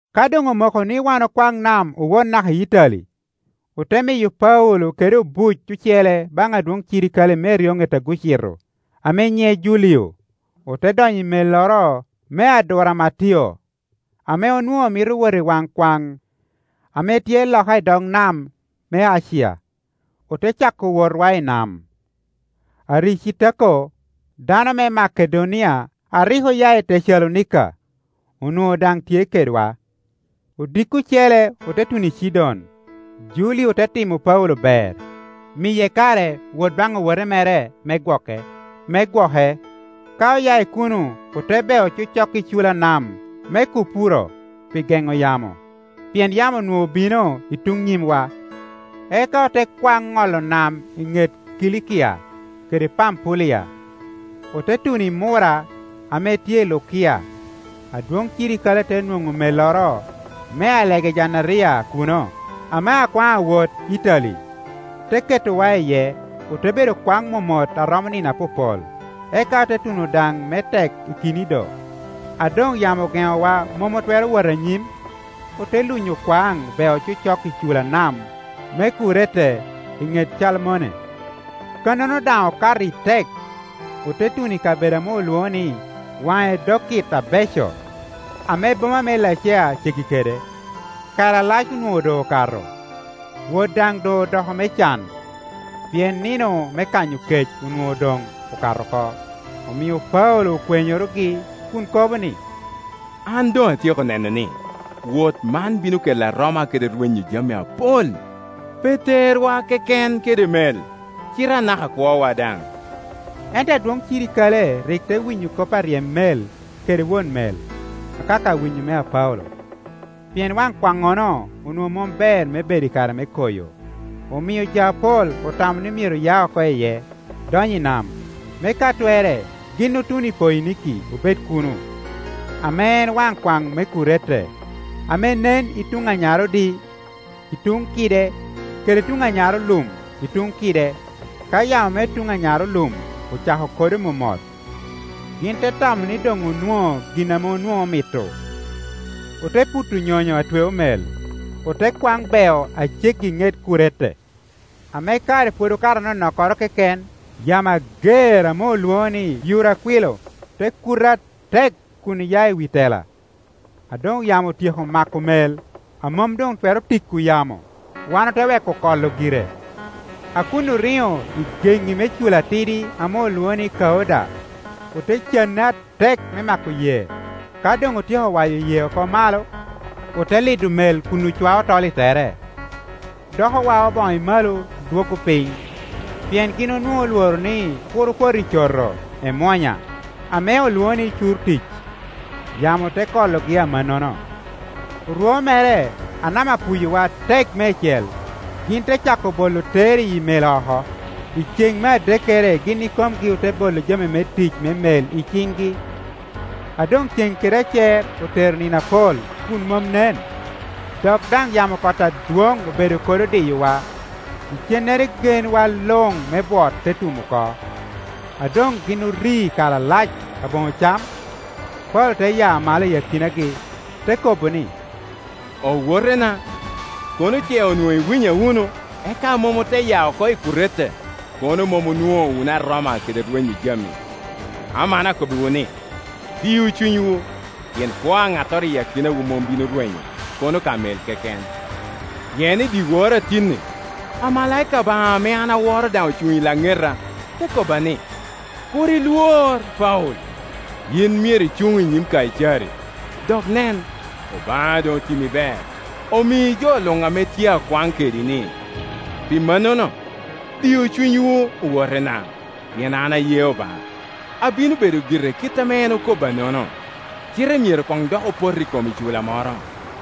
Ka doŋ omoko ni wan okwaŋ nam owot naka i Itali, ote miyo Paulo kede obuc ocele baŋ adwoŋ cirikale me eryoŋet Augucito, ame nyiŋe Julio. Ote donyo i melloro me Aduramatio, ame onwoŋo mito wot i waŋ kwaŋ ame tye loka i dog nam me Acia, ote cako wotwa i nam. Aricitako, dano me Makedonia a rik oya i Tecalonika, onwoŋo daŋ tye kedwa. Odiko ocele ote tuno Cidon; Julio te timo Paulo ber, miye kare wot baŋ owote mere me gwoke. Ka oya i kuno ote beo cocok i cula nam me Kupuro pi geŋo yamo, pien yamo onwoŋo obino i tuŋ nyimwa. Eka ote kwaŋ ŋolo nam i ŋet Kilikia kede Pampulia, ote tuno i Mura ame tye i Lukia. Adwoŋ cirikale te nwoŋo melloro me Alegejandaria kuno, ame akwaŋ awot Itali, te ketowa iye. Ote bedo kwaŋ momot a romo nino apopol, eka ote tuno daŋ me tek i Kinido. A doŋ yamo ogeŋowa mom otwero wot anyim, ote lunyo kwaŋ bea cocok i cula nam me Kurete i ŋet Calmone. Kannono daŋ okato i tek, ote tuno i kabedo ame olwoŋo ni, Waŋ Edokit Abeco, ame boma me Lacea ceggi kede. Kare alac onwoŋo doŋ okato, wot daŋ doŋ odoko me can, pien nino me kanyo kec onwoŋo doŋokato oko, omio Paulo okwenyorogi, kun kobo ni, “An doŋ atyeko neno ni, wot man bino kelo aroma kede rwenyo jami apol, pe terwa keken kede mel, cite anaka kwowa daŋ.” Ento adwoŋ cirikale rik te winyo kop aryem mel kede won mel, akaka winyo mea Paulo. Pien wan kwannono onwoŋo mom ber me bedo i kare me koyo, omio jo apol otamo ni myero ya oko iye, dony i nam, me ka twerre gin otun i Poiniki obed kuno; ame en waŋ kwaŋ me Kurete ame nen i tun anyarodi i tuŋ kide kede i tuŋ anyarolum i tuŋ kide. Ka yamo me tuŋ anyarolum ocako kodo momot, gin te tamo ni doŋ onwoŋo gin ame onwoŋo omito, ote puto nyonyo a tweo mel, ote kwaŋ beo a ceggi i ŋet Kurete. Ame kare pwod okato anonokkoro keken, yamo ager ame olwoŋo ni Yurakwilo te kuto atek kun ya i wi tela. A doŋyamo otyeko mako mel a mom doŋtwero tiko yamo, wan ote weko kolo gire. A kun oriŋo i geŋŋi me cula atidi ame olwoŋo ni Kauda, ote canne atek me mako yee. Ka doŋotyeko waya yee oko malo, ote lido mel kun ucwao tol i tere; dok owao boŋo i malo dwoggo piny, pien gin onwoŋo olworo ni kur opot i coto emwonya ame olwoŋo ni Curtic, yamo te kologi amannono. Orwo mere, a nam apuyowa atek meicel, gin te cako bolo ter i mel oko. I cen me adekkere gin ikomgi ote bolo jami tic me mel i ciŋgi. A doŋceŋ kede acer otero nino apol kun mom nen, dok daŋ yamo kot adwoŋ obedo kodo diyowa, icennere genwa luŋ me bwot te tum oko. A doŋ gin ori kare alac aboŋo cam, Paulo te ya malo i akinagi, te kobo ni, “Owotena, kono ce onwoŋo iwinya wunu, eka mom ote ya oko i Kurete, kono mom onwoŋo wunu aroma kede rwenyo jami. Aman akobbiwu ni, diu cunywu; pien kwo a ŋattoro i akinawu mom bino rwenyo, kono ka mel keken. Pien i dyewor a tin-ni, amalaika Obaŋa ame an aworo daŋ ocuŋ i laŋeta, te kobba ni, ‘Kur ilwor, Paulo. Yin myero icuŋ i nyim Kaicari; dok, nen, Obaŋa doŋ otimo ber, omii jo luŋ ame tye a kwaŋ kedi-ni.’ Pi mannono, diu cunywu, owotena, pien an aye Obaŋa, abino bedo gire kit ame en okobba-nono. Cite myero koŋ dok opot i kom icula moro.”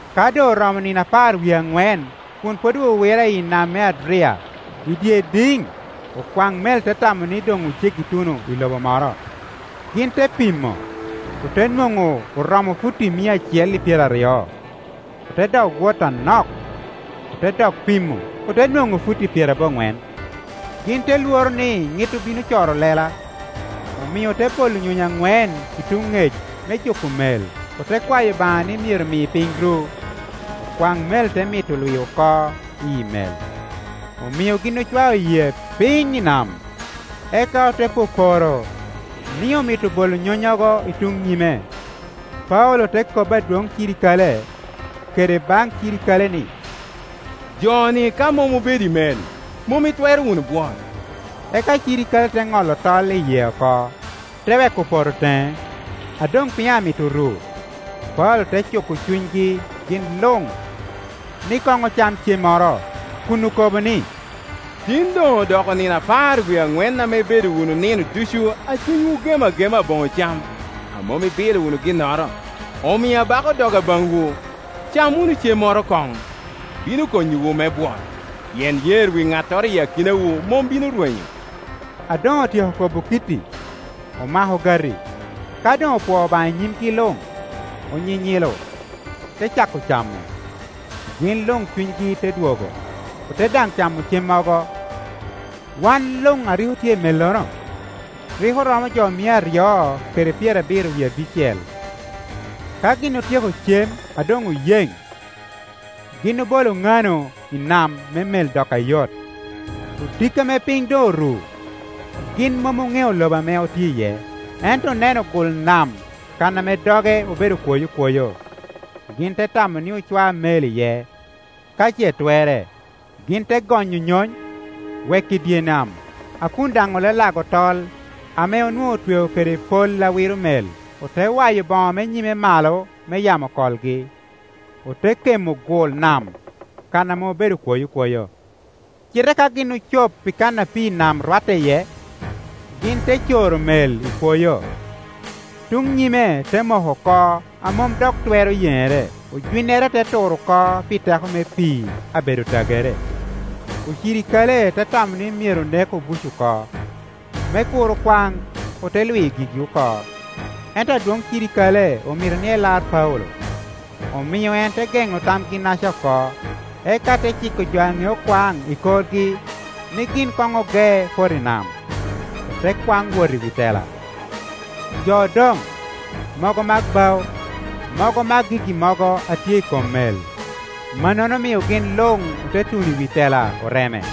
Ka doŋ oromo nino apar wie aŋwen kun pwod owiwira i nam me Adria, i dye idiŋ, okwaŋ mel te tamo ni doŋ oceggi tuno i lobo moro. Gin te pimo, ote nwoŋo oromo futi mia acel i pyeraryo. Ote dok wot anok, ote dok pimo, ote nwoŋo futi pyeraboŋwen. Gin te lworo ni ŋit obino coro lela, omio ote bolo nyonyo aŋwen i tuŋ ŋec me juko mel, ote kwayo Obaŋa ni myero mi piny ru. Okwaŋ mel te mito lwi oko iyi mel, omio gin ocwao yee piny i nam, eka ote poporo ni omito bolo nyonnyogo i tuŋ nyime. Paulo te kobbi adwoŋ me cirikale, kede baŋ cirikale ni, “Jo-ni ka mom obedo i mel, mom itwero wunu bwot.” Eka cirikale te ŋolo tol i yee oko, te weko poto teŋe. A doŋ piny amito ru, Paulo te cuko cunygi gin luŋ, ni koŋ ocam cemmoro, kun okobo ni, “Tin doŋ odoko nino apar wie aŋwen ame ibedo wunu nino ducu a cunywu ogem agema aboŋo cam, a mom ibilo wunu ginnoro. Omio abako doga baŋwu, cam wunu cemmoro koŋ; bino konyowu me-bwot, pien yer wi ŋattoro i akinawu mom bino rwenyo.” A doŋ otyeko kobo kit-ti, omako ogati; ka doŋ opwoo Obaŋa i nyimgi luŋ, onyinyilo, te cako camo. Gin luŋ cunygi te dwogo, ote daŋ camo cemmogo. (Wan luŋ a rik otye i mellono, rik oromo jo mia aryo kede pyerabiro wie abicel.) Ka gin otyeko cem a doŋ oyeŋ, gin obolo ŋano i nam me mel dok ayot. Odiko ame piny doŋ oru, gin mom oŋeo lobo ame otye iye, ento oneno gul nam kan ame doge obedo kwoyokwoyo, gin te tamo ni ocwa mel iye ka ce twerre. Gin te gonyo nyony, weko i dye nam, a kun daŋ olalago tol ame onwoŋo otweo kede pol a wiro mel, ote waya boŋo me nyime malo me yamo kolgi, ote kemo gul nam kan ame obedo kwoyokwoyo. Cite ka gin ocop i kan ame pii i nam rwatte iye, gin te coro mel i kwoyo; tuŋ nyime te moko oko a mom dok twero yeŋere, ojwinnere te tur oko pi teko me pii a bedo tagere. Ocirikale te tamo ni myero onek obuc oko, me kur okwaŋ, ote lwi gigi oko. Ento adwoŋ cirikale omito ni elar Paulo, omio en te geŋo tamgi-naca oko; eka te ciko jo a ŋeo kwaŋ i korgi ni gin koŋ oge poto i nam, ote kwaŋ wot i wi tela. Jo odoŋ, mogo mak bao, mogo mak gigi mogo a tye i kom mel. Mannono omio gin luŋ ote tuno i wi tela oreme.